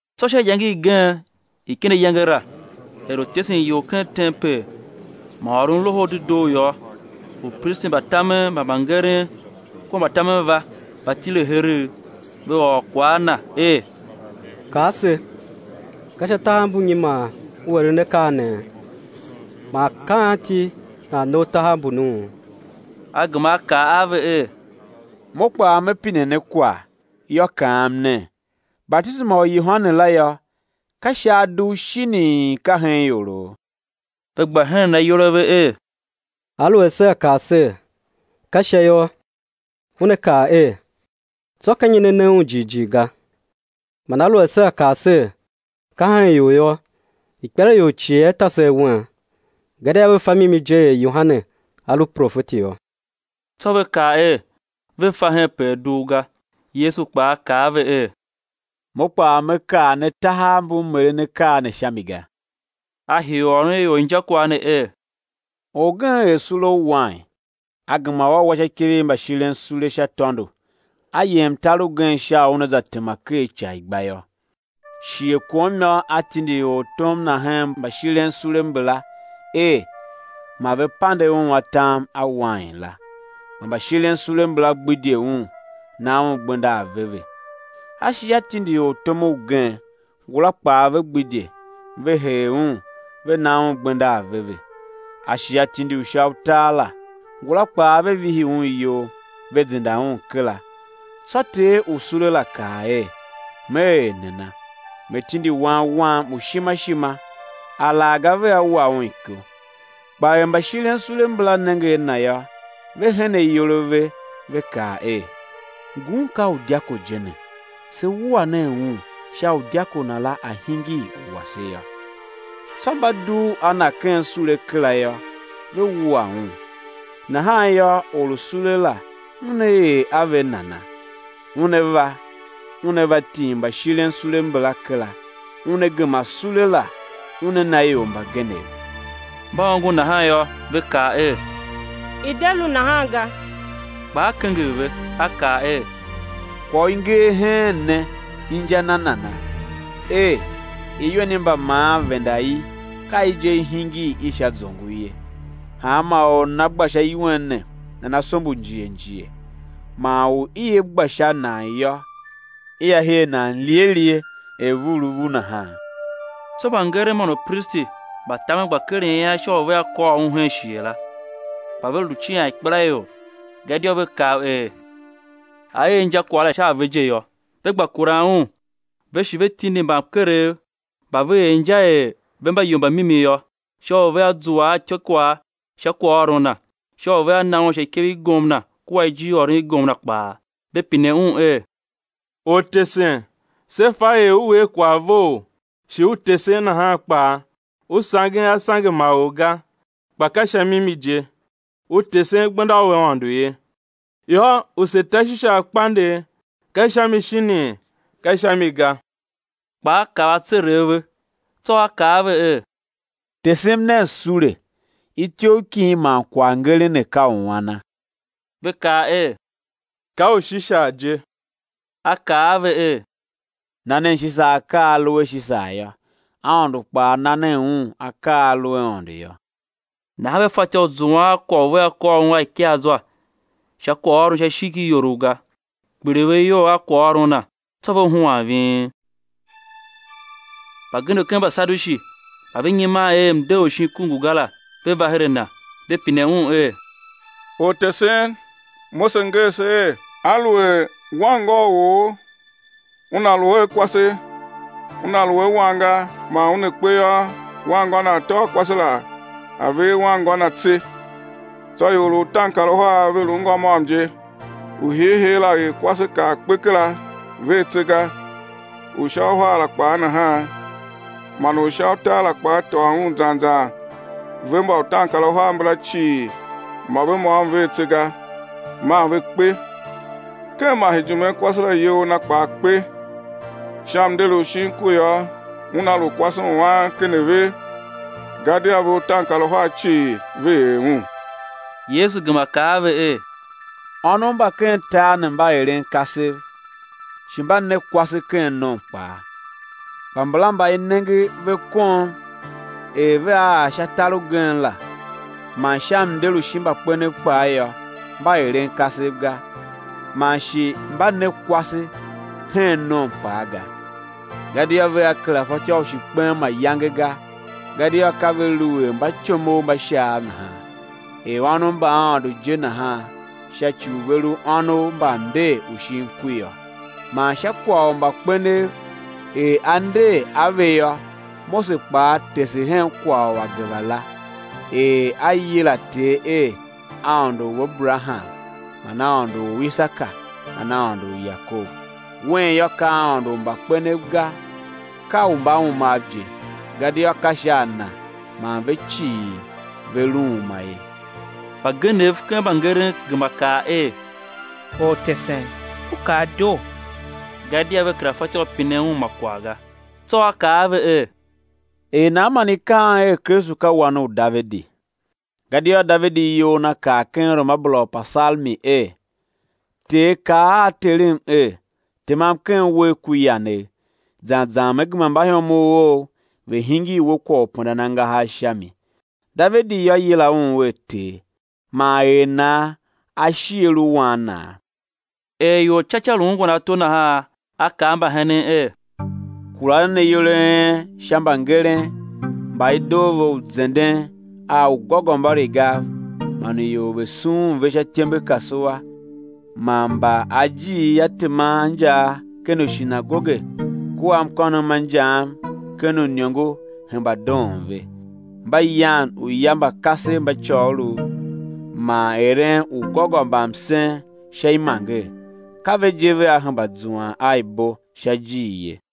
Tsô sha iyange igen i ken ayange la, er lu tesen ior ken tempel, man ôron Loho u Dedoo yô, upristi mba tamen man mbangeren kua mbatamen va, va tile heregh; ve ôr kwagh a Na er: Kaa se: Ka sha tahav mbu nyi man U eren akaa nee? Man ka anti nan ne U tahav mbunuu? A gema A kaa a ve er: Mo kpaa me pine ne kwagh, yô, kaam nen: Batisema u Yohane la yô, ka Sha a dugh, shinii, ka hen ioroo? Ve gba henen ayol a ve er: Aluer sea kaa ser: Ka Sha yô, Una kaa er: Tsô ka nyi ne na un jighjigh ga? Man aluer sea kaa ser: Ka hen ior yô, ikpelaior cii ia ta se awen, gadia ve fa mimi je er Yohane a lu profeti yô. Tsô ve kaa er, ve fa hen pe a dugh ga. Yesu kpaa kaa a ve er: Mo kpaa Me kaa ne tahav mbu M eren akaa ne sha mi ga. A hii u ôron ior injakwagh ne er: Orgen er sule u wain, a gema u a wa sha ikev i mbashiren sule sha tôndo, a yem tar ugen sha u una za tema ker ica i gba yô. Shighe kom yô, a tindi ortom na hen mbashirensule mbala er ma ve pande un atam a wain la; kpa mbashirensule mbala gbidye un, na un gbenda aveve. A shi a tindi ortom ugen; ngula kpaa ve gbidye, ve hee un, ve na un gbenda aveve. A shi a tindi u sha utar la; ngula kpaa ve vihi un iyol, ve zenda un kera. Tsô ter u sule la kaa er: Me er nana? Me tindi wan wam u ishima ishima, alaghga vea wa un iko. Kpa er mbashirensule mbala nenge a na yô, ve hen ayol a ve, ve kaa er: Ngun ka u dyako je ne, se wua nen un, sha u dyako la a̱ hingir u wase yô. Tsô mba dugh a Na ken sule kera yô, ve wua un. Nahan yô, or u sule la una er a ve nana? Una va, una va tim mbashirensule mbala kera, una gema sule la una na ior mbagenev. Mba ongo nahan yô, ve kaa er: I̱ de lu nahan ga! Kpa A kenger ve, A kaa er: Kwagh u i nger heen ne inja na nana? er: Iwen i mbamaan venda i, ka i je, i hingir i sha zongo ye. Hanma or u nana gba sha iwen ne, nana sombo njighe njighe, man u ia gba sha a nan yô, ia her nan lighe lighe er vuulevu nahan. Tsô mbangeren man upristi mba tamen gba keren ian sha u vea kôr Un hen shighe la, kpa ve lu cian ikpelaior, gadia ve kav er A er injakwagh la sha a ve je yô. Ve gba kuran Un, ve shi ve tindi mbamkerev mba ve er inja er ve mba ior mba mimi yô, sha u vea zua a ityôkwagh sha kwaghôron Na, sha u vea na Un sha ikev i gomna kua ijirôron i gomna kpaa. Ve pine Un er: Ortesen, se fa er U er kwagh vough, shi U tesen nahan kpaa, U sangen a sange ma or ga, kpa ka sha mimi je U tesen gbenda u Aôndo ye. Yô, u sé ta Shisar kpandegh, ka sha mi shinii, ka sha mi ga? Kpa A kav atseregh a ve, tsô A kaa a ve er: Tesem nen sule; ityough kin man kwaghngeren ne ka u ana? Ve kaa er: Ka u Shisar je! A kaa a ve er: Na nen Shisar akaa a a lu a Shisar yô, Aôndo kpaa na nen un akaa a a lu a Aôndo yô. Nahan ve fatyô u zuan a kwagh u vea kôr Un a ikaazwa sha kwaghôron sha ishigh ki iorough ga. Kpiligh ve iyol a kwaghôron Na, tsô ve huan ving. Mbagenev ken Mbasadushi mba ve nyiman er mnder u shin ku ngu ga la, va her a Na, ve pine Un er: Ortesen, Mose nger se er: Aluer wanngô u or una lu a kwase, una lu a wan ga, man una kpe yô, wanngô na a̱ tôô kwase la, a̱ ver wanngô na tse. Tsô ior lu utaankaruhar, ve lu ngô môm je; u hiihii la er kwase, kar kpe kera, ver tse ga. U sha uhar la kpaa nahan, man u sha utar la kpaa tôô un zan zan ve mba utaankaruhar mbala cii, mô ve môm ver tse ga, maa ve kpe ken masejime kwase la iyol na kpaa kpe. Sha mnder u shin ku yô, una lu kwase u an ken a ve? Gadia ve utaankaruhar cii ve er un. Yesu gema kaa a ve er: Ônov mba ken tar ne mba eren kasev, shi mba ne kwase ken nom kpaa; kpa mbala mba i nenge ve kom er vea ar sha tar ugen la, man sha mnder u shin mbakpenev kpaa yô, mba eren kasev ga, man shi mba ne kwase hen nom kpaa ga. Gadia vea kera fatyô u shi kpen mayange ga, gadia ka ve lu er mbatyomov mba Shaav nahan, er ônov mba Aôndo je nahan sha ci u ve lu ônov mba mnder u shin ku yô. Man sha kwagh u mbakpenev er á nder a ve yô, Mose kpaa tese hen kwagh u ageva la, er a yila Ter er Aôndo u Aberaham, man Aôndo u Isaka, man Aôndo u Yakob. Wen yô, ka Aôndo u mbakpenev ga, ka u mbaumav je, gadia ka sha a Na man ve cii ve lu uma ye. Mbagenev ken mbangeren gema kaa er: Ortesen, U kaa doo! Gadia ve kera fatyô u pinen Un ma kwagh ga. Tsô A kaa a ve er: Er nan man i kaan er, Kristu ka Wan u Davidi? Gadia Davidi iyol na kaa ken ruamabera u Upasalmi er: Ter kaa a Terem er: Temam ken uwegh ku yanegh, zan zan Me gema mbaihomov Ou ve̱ hingir We kwagh u pendan angahar sha mi. Davidi yô, yila Un er Ter, man er nan A shi A lu Wan Naa? Er ior ca ca lu ungwan ato nahan, A kaa a mbahenen er: Kura nen ayol a en sha mbangeren, mba i doo ve u zenden a ugôgômbarigav man u ior ve̱ sughun ve sha ityembe kasua, man mba ajiir a teman a injaa ken ushinagoge kua mkônom ma injaam ken uiniongo hemba doon ve; mba yan uya mba kasev mba côgholov, man eren ugôgômbamsen sha imanger; ka ve je vea hemba zuan a ibo sha ijir ye.